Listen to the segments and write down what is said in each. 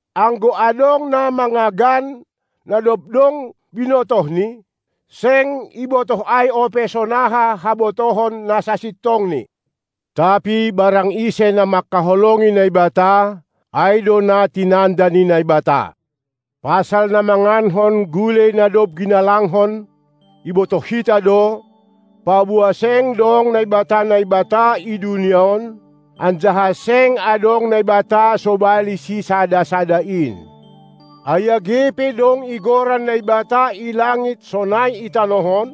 Anggo adong na mangagan, na dob dong binotohni, seng ibotoh ai ope sonaha habotohon na sasintongni. Tapi barang ise na mangkaholongi Naibata, ai do na tinanda ni Naibata. Pasal na mangankon gulei na dob ginalangkon, ibotoh hita do, paboa seng dong naibata-naibata i dunia on, anjaha seng adong Naibata sobali Sisada-sada in. Ai age pe dong igoran naibata i langit sonai i tanoh on,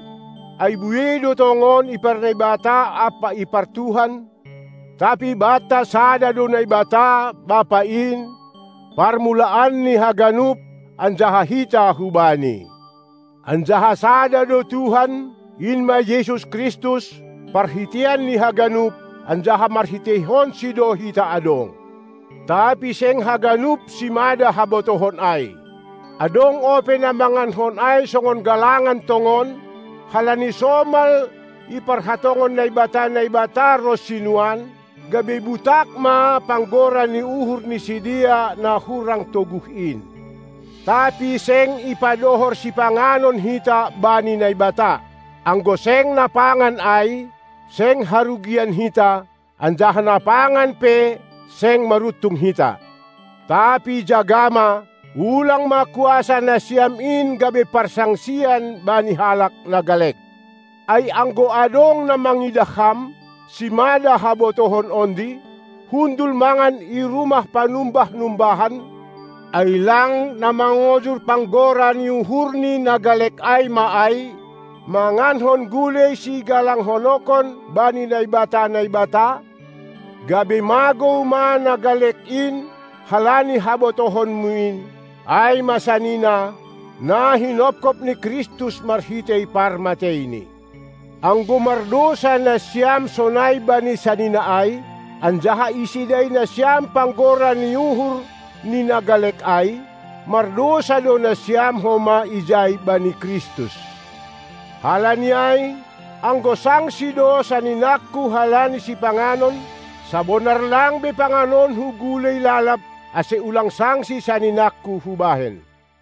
ai buei do tongon iparnaibata ampa ipartuhan, tapi banta sada do Naibata, Bapa in, parmulaan ni haganup anjaha hita hu-Bani; anjaha sada do Tuhan, in ma Jesus Kristus, parhiteian ni haganup, anjaha marhiteihonsi do hita adong. Tapi seng haganup simada habotohon ai. Adong ope na mangankon ai songon galangan tongon, halani somal iparhatongon naibata-naibata ronsi nuan, gabe butak ma panggora ni uhur ni sidea na hurang toguh in. Tapi seng ipadohor sipanganon hita bani Naibata. Anggo seng napangan ai, seng harugian hita, anjaha napangan pe seng maruntung hita. Tapi jaga ma, ulang ma kuasa nasiam in gabe parsangsian bani halak na galek. Ai anggo adong na mangidah ham, simada habotohon ondi, hundul mangan i rumah panumbah-numbahan, ai lang na mangojur panggora ni uhurni na galek ai ma ai, mangankon gulei sigalanghononkon bani naibata-naibata? Gabe magou ma na galek in halani habotohonmu in, ai ma sanina, na hinopkop ni Kristus marhitei parmateiNi. Anggo mardousa nasiam sonai bani sanina ai, anjaha isedai nasiam panggora ni uhur ni na galek ai, mardousa do nasiam homa ijai bani Kristus. Halani ai, anggo sangsi do saninangku halani sipanganon, sabonar lang be panganonku gulei lalab, ase ulang sangsi saninangku hubahen.